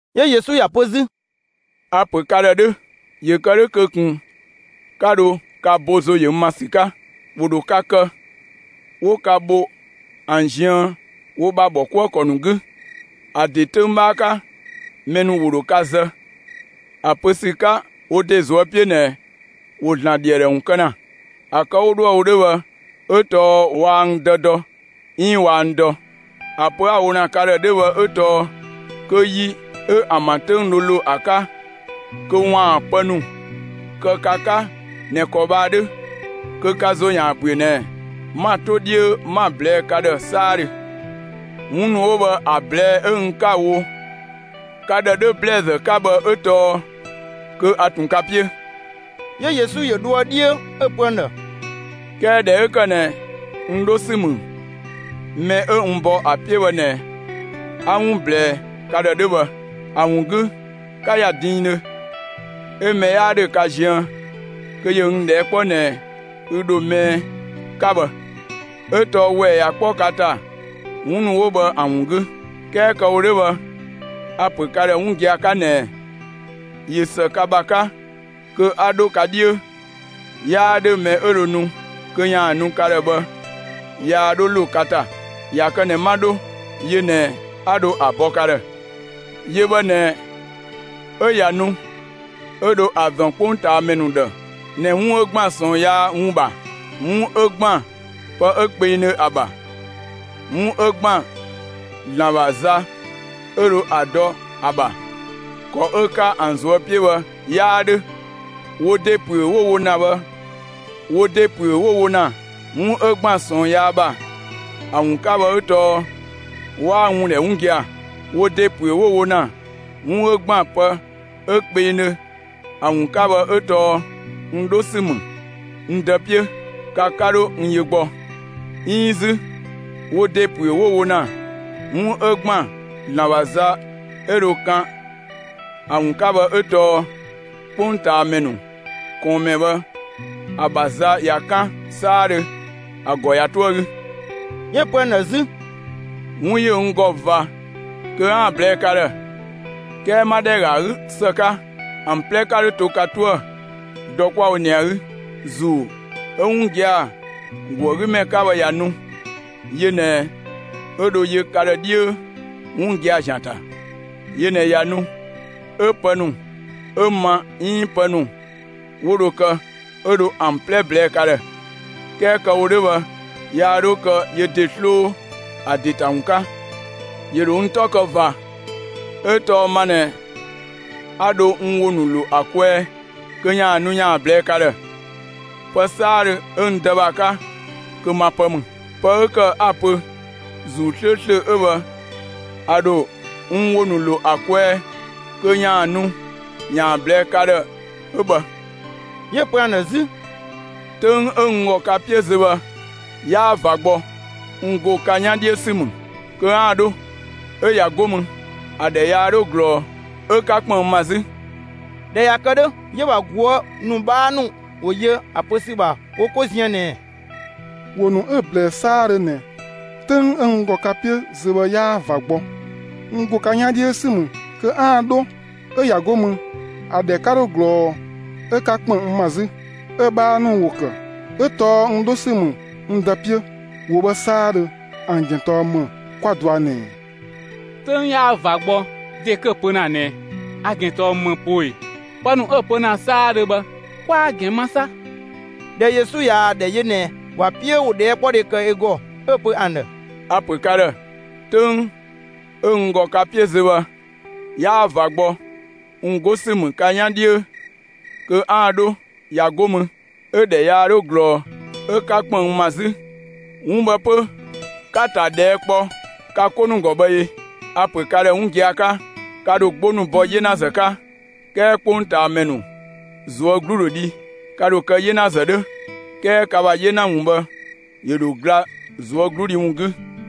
'Yö Yesu ‑ya pö 'zü: «A‑ ‑pö ka ‑dhë 'dhö, ‑yö kë 'dhö kö ꞊kun 'ka dho ka bo ‑zo ‑yö n ‑ma ‑sü 'ka. ‑Wo ‑dho ka kë, 'wo ka bho ‑an ziën wo ‑bha ‑bhɔkuëkɔ ‑nu 'gü. ‑A ‑de 'töng 'bhaa 'ka, mɛ ‑nu ‑wo ‑dho ka zë ‑a pö ‑sü 'ka wo ‑de ꞊zuö' 'piö ꞊nɛ ‑wo ‑Zlan ‑dhi ‑a ‑dhë ‑wun kë ‑na. ‑A kë 'wo dhoë‑ wo 'dhö bhë 'ö tɔɔ waa n Dë dɔ 'iin waa n dɔ. ‑A pö 'a‑ wo ‑na ka ‑dhë 'dhö bhë 'ö tɔɔ kö yi 'ö ‑an ‑bha 'töng dho ‑lo ‑a 'ka kö ‑waan pë ‑nu kë ka 'ka ꞊nɛ ‑kɔ bhë ‑a 'dhö, kö ka ‑zo ‑yaan ‑büö ꞊nɛ 'ma‑ 'to 'dhiö 'ma‑ ꞊blɛɛ' ka ‑dhë 'saadhö. 'Wun ‑nu 'wo bhë ‑a ꞊blɛɛ' 'ö n 'ka‑ wo ka ‑dhë 'dhö ‑blɛɛzë 'ka bhë 'ö tɔɔ kö a ꞊tun ka 'piö.» 'Yö Yesu ‑yö dhoë 'dhiö, 'ö‑ pö ‑an ‑dhë: «'Kɛɛ ꞊dhɛ 'ö ‑kë ꞊nɛ n 'dho ‑sü ‑mü mɛ 'ö n bɔ ‑a 'piö bhë ꞊nɛ, 'a 'wun ꞊blɛɛ ka ‑dhë 'dhö bhë. ‑A ‑wun 'gü 'ka ‑ya diindhö, 'ö mɛ 'yaa ‑dhö ka ziën kö ‑yö n ꞊dhɛɛ' 'kpɔ ꞊nɛɛ: ‹Ü ‑dho mɛɛ?› 'ka bhë, 'ö tɔɔ ‑wɛɛ ꞊ya 'kpɔ ka ‑ta 'wun ‑nu 'wo bhë ‑a ‑wun 'gü. 'Kɛɛ kë‑ wo 'dhö bhë, a‑ ‑pö ka ‑dhë 'wun gia‑ 'ka ꞊nɛɛ: ꞊Yö ‑së ka ‑bha 'ka kö 'a 'dho ka 'dhiö, 'yaa 'dhö mɛ 'ö dho nu kö ‑yaan nu ka ‑dhë bhë yaa 'dho ‑lo ka ‑ta. ꞊Ya kë ꞊nɛ 'ma 'dho, yö ꞊nɛ 'a dho ‑a bɔ ka ‑dhë. Yö bhë ꞊nɛ 'ö ꞊ya nu, 'ö dho ‑a ‑zɔn 'kpongtaamɛ ‑nu ‑dhë ꞊nɛ 'wun 'ö ‑gban ꞊sɔɔn yaa ‑wun ‑bha, 'wun 'ö ‑gban pë 'ö kpengdhö ‑a ‑bha, 'wun 'ö ‑gban ‑Zlan ‑bha za 'ö dho ‑a dɔ ‑a ‑bha, ‑kɔ 'ö‑ 'ka ‑an ꞊zuö' 'piö bhë 'yaa 'dhö; wo ‑de ‑püö 'wo‑ wo ‑na bhë. Wo ‑de ‑püö 'wo‑ wo ‑na 'wun 'ö ‑gban ꞊sɔɔn yaa ‑bha ‑a ‑wun 'ka bhë 'ö tɔɔ 'waa n ‑wun ‑dhɛ 'wun gia‑. Wo ‑de ‑püö 'wo‑ wo ‑na 'wun 'ö ‑gban pë 'ö kpengdhö ‑a ‑wun 'ka bhë 'ö tɔɔ n 'dho ‑sü ‑mü n Dë 'piö; ka 'ka 'dho n yö gbɔ; 'iin 'zü, wo ‑de ‑püö 'wo‑ wo ‑na 'wun 'ö ‑gban ‑Zlan ‑bha za 'ö dho ‑a kan ‑a ‑wun 'ka bhë 'ö tɔɔ 'kpongtaamɛ ‑nu ꞊kɔɔnmɛ bhë ‑a ‑bha za ꞊ya 'kan 'saadhö, ‑a ‑gɔ ꞊ya 'toë‑ 'gü.» 'Yö‑ pö ‑an ‑dhë 'zü: «'Wun ‑yö n ‑gɔ ꞊va kö 'aan‑ ꞊blɛɛ'‑ ka ‑dhë; 'kɛɛ 'ma ‑dhɛ ‑ga ‑a 'gü ‑së 'ka, ‑an 'plɛ 'ka 'dho to ka 'toë‑, dɔ 'kwa‑ wo ꞊nɛ ‑a 'gü. ‑Zuu 'ö 'wun gia‑ ‑go ‑a 'gü ‑mɛ 'ka bhë ꞊ya nu, yö ꞊nɛ 'ö dho yö ka ‑dhë 'dhiö 'wun gia‑ ‑zian ‑ta. Yö ꞊nɛ ꞊ya nu, 'ö pë ‑nu 'ö‑ ma 'iin pë ‑nu 'wo dho kë, 'ö dho ‑an 'plɛ ꞊blɛɛ' ka ‑dhë. 'Kɛɛ kë‑ wo 'dhö bhë, yaa 'dho kë yö ‑de 'sloo ‑a ‑de ‑ta ‑wun 'ka. ‑Yö ‑dho n 'tɔ kë ꞊va, 'ö tɔɔ ma ꞊nɛ 'a dho n ‑wo ‑nu ‑lo ‑a kwɛɛ kö ‑yaan nu ‑yaan ꞊blɛɛ'‑ ka ‑dhë. Pë 'saadhö 'ö n Dë ‑bha 'ka, kö ma pë ‑mü. Pë 'ö ‑kë 'a‑ pö ‑Zuu 'slööslö 'ö bhë a ‑dho n ‑wo ‑nu ‑lo ‑a kwɛɛ kö ‑yaan nu ‑yaan ꞊blɛɛ'‑ ka ‑dhë 'ö bhë.» 'Yö‑ pö ‑an ‑dhë 'zü: «'Töng 'ö n ‑gɔ ka 'piö zö bhë 'yaa ꞊va gbɔ; n ‑go ka 'yan 'dhiö ‑sü ‑mü kö 'aan‑ 'dho; 'ö ꞊ya 'go mü, ‑a ‑dhɛ yaa 'dhö ꞊glɔɔ 'ö 'ka ‑kpën n ‑ma 'zü.» ꞊Dhɛ ꞊ya kë 'dhö, 'yö‑ ‑bha ꞊guë' ‑nu 'bhaa ‑nu ‑wo yö ‑a pö ‑sü ‑bha wo 'ko ziën ꞊nɛɛ: «‑Wo ‑nu 'ö‑ ꞊blɛɛ 'saadhö ꞊nɛ ‹'töng 'ö n ‑gɔ ka 'piö zö bhë yaa ꞊va gbɔ; n ‑go ka 'yan 'dhiö ‑sü ‑mü kö 'aan‑ 'dho, 'ö ꞊ya 'go mü, ‑a ‑dhɛ 'ka 'dho ꞊glɔɔ 'ö 'ka ‑kpën n ‑ma 'zü›, 'ö‑ 'bhaa ‑nu ‑wo ‑kë ‹'ö tɔɔ n 'dho ‑sü ‑mü n Dë 'piö› 'wo bhë 'saadhö, ‑an ‑gɛn tɔɔ ‑më, 'kwa dɔa ꞊nɛɛ? ‹'Töng 'yaa ꞊va gbɔ› ‑de 'kö‑ pö ‑na ꞊nɛ ‑a ‑gɛn tɔɔ ‑më poo ꞊ee? Pë ‑nu 'ö‑ pö ‑na 'saadhö bhë, 'kwaa‑ ‑gɛn ma 'sa!» ꞊Dhɛ Yesu ꞊yaa‑ ‑dhɛ yö ꞊nɛ ‑wa 'piö 'wo ꞊dhɛɛkpɔdhe kë ö ‑gɔ, 'ö‑ pö ‑an ‑dhë: «A‑ ‑pö ka ‑dhë: 'Töng 'ö n ‑gɔ ka 'piö zö bhë 'yaa ꞊va gbɔ; n 'go ‑sü ‑mü ka 'yan 'dhiö kö 'aan‑ 'dho, ꞊ya 'go mü, ‑a ‑dhɛ yaa 'dhö ꞊glɔɔ 'ö 'ka ‑kpën n ‑ma 'zü; 'wun bhë 'pö 'ka‑ ‑ta ꞊dhɛɛ' kpɔ ka 'ko ‑nu ‑gɔ bhë ee? A‑ ‑pö ka ‑dhë 'wun gia‑ 'ka: Ka ‑dho 'gbo ‑nu bɔ 'yenazë 'ka; 'kɛɛ 'kpongtaamɛ ‑nu ꞊zuö' 'glu ‑dho dhi. Ka ‑dho kë 'yenazë 'dhö, 'kɛɛ ka ‑bha 'yena ‑wun bhë ‑yö ‑dho gla ꞊zuögludhi ‑wun 'gü.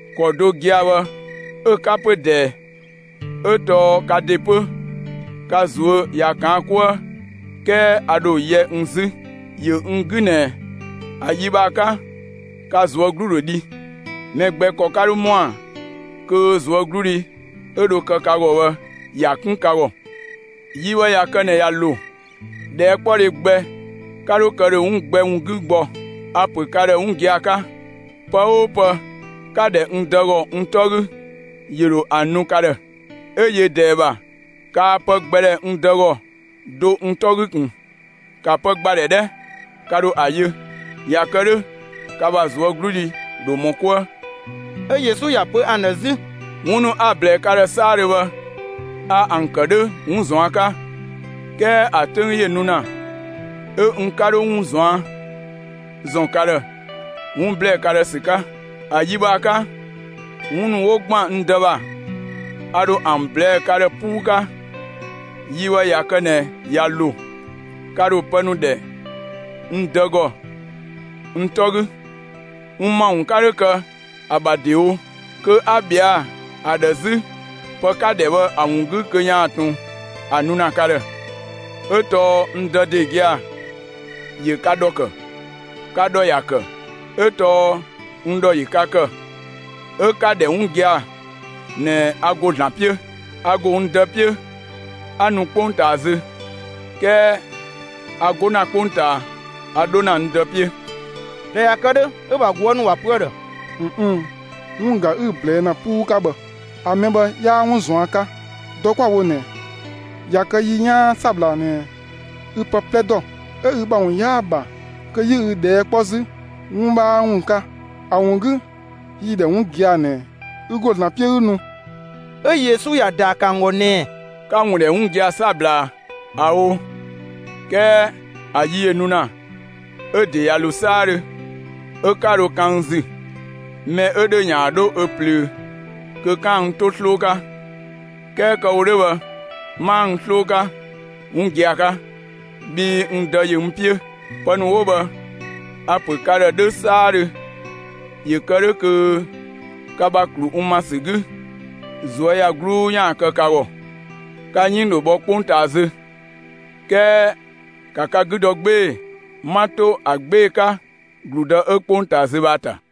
‑Kɔ do gia‑ bhë 'ö‑ 'ka 'pö ꞊dɛɛ. 'Ö tɔɔ ka ‑de 'pö ka ꞊zuö' ꞊ya ꞊kaan' 'kuë. 'Kɛɛ a ‑dho yɛ n 'zü. ‑Yö n 'gü ꞊nɛ ‑a yi bhë ‑a 'ka, ka ꞊zuö' 'glu ‑dho dhi; mɛ gbɛ ‑kɔ 'ka 'dho ‑mɔa kö ꞊zuögludhi 'ö dho kë ka ‑gɔ bhë, ‑ya 'kun ka ‑gɔ. Yi bhë ꞊ya kë ꞊nɛ ꞊ya ‑lo, ꞊dhɛɛkpɔdhe gbɛ 'ka 'dho kë ‑dhö 'wun gbɛ ‑wun 'gü gbɔ. A‑ ‑pö ka ‑dhë 'wun gia‑ 'ka: Pë 'oo pë 'ka‑ ‑dhɛ n Dë ‑gɔ n 'tɔ 'gü, ‑yö ‑dho ‑a nu ka ‑dhë. 'Ö yö ꞊dɛɛ ‑bha, kaa pë gbɛ ‑dhɛ n Dë ‑gɔ do n 'tɔ 'gü ꞊kun. ‑Ka pë ‑gba ‑dhɛ 'dhɛ! Ka ‑dho ‑a yö; ꞊ya kë 'dhö ka ‑bha ꞊zuögludhi ‑dho ‑mɔ 'kuë.» 'Ö Yesu ‑ya pö ‑an ‑dhë 'zü: «'Wun ‑nu 'a‑ ꞊blɛɛ ka ‑dhë 'saadhö bhë, a ‑an ‑kë 'dhö 'wun ꞊zuan' 'ka. 'Kɛɛ ‑a 'töng ‑yö nu ‑na 'ö n 'ka 'dho 'wun ꞊zuan' ‑zɔn ka ‑dhë, 'wun ‑blɛɛ ka ‑dhë ‑sü 'ka; ‑a yi bhë ‑a 'ka, 'wun ‑nu 'wo ‑gban n Dë ‑bha, a ‑dho ‑an ꞊blɛɛ'‑ ka ‑dhë 'puu 'ka. Yi bhë ꞊ya kë ꞊nɛ ꞊ya ‑lo, ka ‑dho pë ‑nu ‑dhɛ n Dë ‑gɔ n 'tɔ 'gü; n ‑ma ‑wun 'ka 'dho kë ‑a ‑bha ‑dewo kö 'a ꞊bhɛa' ‑a ‑dhë 'zü pë 'ka‑ ‑dhɛ bhë ‑a ‑wun 'gü kö ‑yaan ꞊tun ‑a nu ‑na ka ‑dhë, 'Ö tɔɔ n Dë ‑de gia‑ ‑yö ka ‑dhɔ ‑kë. Ka ‑dhɔ ‑ya ‑kë, 'ö tɔɔ n ‑dhɔ ‑yö ka ‑kë, 'ö 'ka‑ ‑dhɛ 'wun gia‑ ꞊nɛ a ‑go ‑Zlan 'piö. A ‑go n Dë 'piö, 'a nu 'kpongtaa zö. 'Kɛɛ a 'go ‑na 'kpongtaa, a 'dho ‑na n Dë 'piö.» ꞊Dhɛ ꞊ya kë 'dhö, 'ö‑ ‑bha ꞊guë' ‑nu ‑wa pö ‑a ‑dhë: «꞊Nnn'‑, 'wun ꞊ga 'ü‑ ꞊blɛɛ' ‑na 'puu 'ka bhë. ‑A mɛ bhë 'yaa 'wun ꞊zuan' 'ka. Dɔ 'kwa‑ wo ꞊nɛ, ꞊ya kë yi 'yaan 'sabla ꞊nɛ ü pë 'plɛ ‑dɔ, 'ö ü ‑bha ‑wun 'yaa‑ ‑bha kö 'yi ü ꞊dhɛɛ' 'kpɔ 'zü 'wun 'bhaa ‑wun 'ka. ‑A ‑wun 'gü, yi‑ ‑dhɛ 'wun gia‑ ꞊nɛ ü ‑go ‑Zlan 'piö 'ü nu.» 'Ö Yesu ‑ya ‑daa ‑kë ‑an ‑gɔ ꞊nɛɛ: «'Ka‑ ‑wun ‑dhɛ 'wun gia‑ 'sabla ‑a? ꞊Ao'; 'kɛɛ ‑a yi ‑yö nu ‑na, 'ö‑ ‑de ꞊ya ‑lo 'saadhö, 'ö 'ka dho kan n ‑zü, mɛ 'ö ‑dhö, ‑yaan 'dho ö ꞊plöö kö 'kaan‑ n 'to 'sloo 'ka. 'Kɛɛ kë‑ wo 'dhö bhë, 'maa n 'sloo 'ka, 'wun gia‑ 'ka, bhii n Dë ‑yö n 'piö. Pë ‑nu 'wo bhë, a‑ ‑pö ka ‑dhë 'dhö 'saadhö ‑yö kë 'dhö kö ka ‑bha ‑klu n ‑ma ‑sü 'gü, ꞊zuöyagluu ‑yaan kë ka ‑gɔ. Ka 'yënng ‑dho bhɔ 'kpongtaa zö. 'Kɛɛ ‑ka ka 'gü dɔ 'gbee‑! 'Ma 'to ‑a 'gbee‑ 'ka ‑gludë 'ö 'kpongtaa zö bhë ‑a ‑ta.»